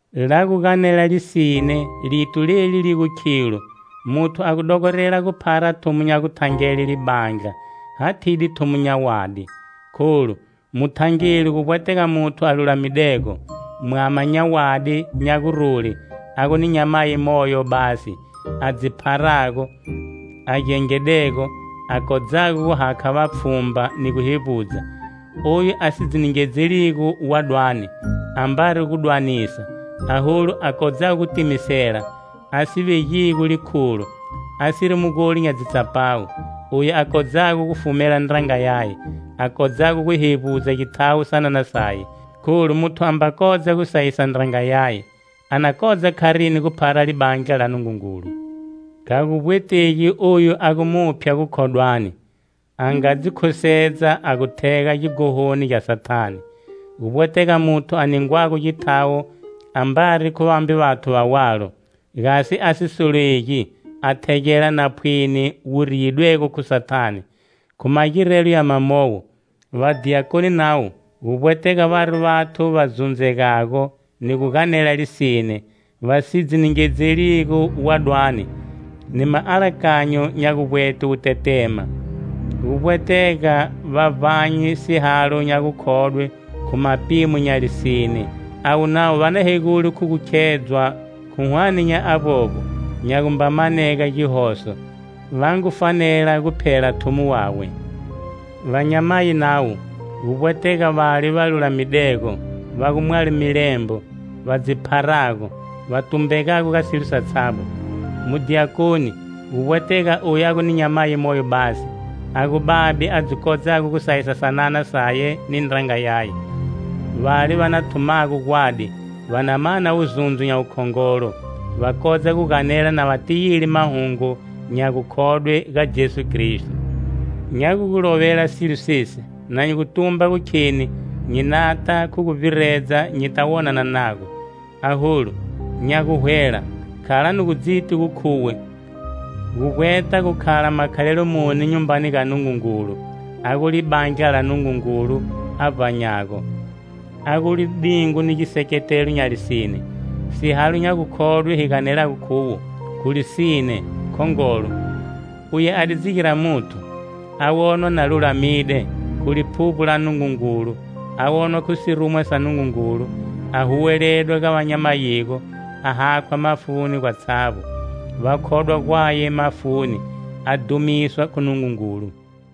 La gu ganela lisine lito leli li gu khilo, muthu a gu dogorela gu phara thumo nya guthangele libandla, hathide thumo nya wadi. Kholu, muthangeli gu vbwetega muthu a lulamidego, mwama nya wadi nya gurule a gu ni nyamayi moyo basi, a dzi pharago, a gengedego, a kodzago guhakha vapfhumba ni guhevbudza. Oyu a si dzi ningedzeligo wadwani, ambari gudwanisa, aholu, a kodzago gu timisela, a si vegigo likhulo, asiri mugoli nya dzitsapawu. Oyu a kodzago gu fumela ndranga yaye, a kodzago gu hevbudza githawo sanana saye. Kholu, muthu amba kodza gu sayisa ndranga yaye, a na kodza kharini gu phara libandla la Nungungulu? Kha gu vbwetegi oyu a gu muphya gukhodwani, a nga dzi khusedza a gu thega gighononi gya Sathane. Gu vbwetega muthu a ningwago githawo ambari khu vambe vathu va walo, gasi a si solegi a thegela napwini wu riyidwego khu Sathane. Khu magirelo ya mamowo, vadiyakoni navo gu vbwetega vari vathu va zundzegago ni gu ganela lisine, va si dzi ningedzeligo wadwani, ni maalakanyo nya guvbwete wutetema, gu vbwetega va vbanye sihalo nya gukhodwe khu mapimo nya lisine. Avo navo va na hegule khu gu khedzwa, khu hwane nya avbovbo, gya gumba manega gihoso, va ngu fanela gu phela thumo wawe. Vanyamayi navo, gu vbwetega vale va lulamidego, va gu mwalo milembo, va dzi pharago, va tumbegago ga silo satshavbo. Mudiyakoni, gu vbwetega oyu a gu ni nyamayi moyo basi, a gu babe a dzi kodzago gu sayisa sanana saye ni ndranga yaye. Vale va na thumago gwadi, va na mana wuzundzo nya wukhongolo, va kodza gu ganela na va tiyile mahungu nya gukhodwe ga Jesu Kristo. Nya gu gu lovela silo sesi na nyi gu tumba gu kheni nyi nata khu gu vbiredza nyita wonana nago. Aholu, nya guhwela, khala nu gu dziti gu khuwe gu vbweta gu khala makhalelo muni nyumbani ga Nungungulu, a gu libandla la Nungungulu a vbanyago, a gu lidingo ni giseketelo nya lisine. Sihalo nya gukhodwe hi ganelago khuwo, khu lisine, khongolo: "Uye a di dzi gira muthu,a wonwa na lulamide khu Liphuvbo la Nungungulu a wonwa khu sirumwa sa Nungungulu,a huweledwa ga va nya mayigo,a hakhwa mafuni gwatshavbo, va khodwa gwaye mafuni a dhumiswa khu Nungungulu."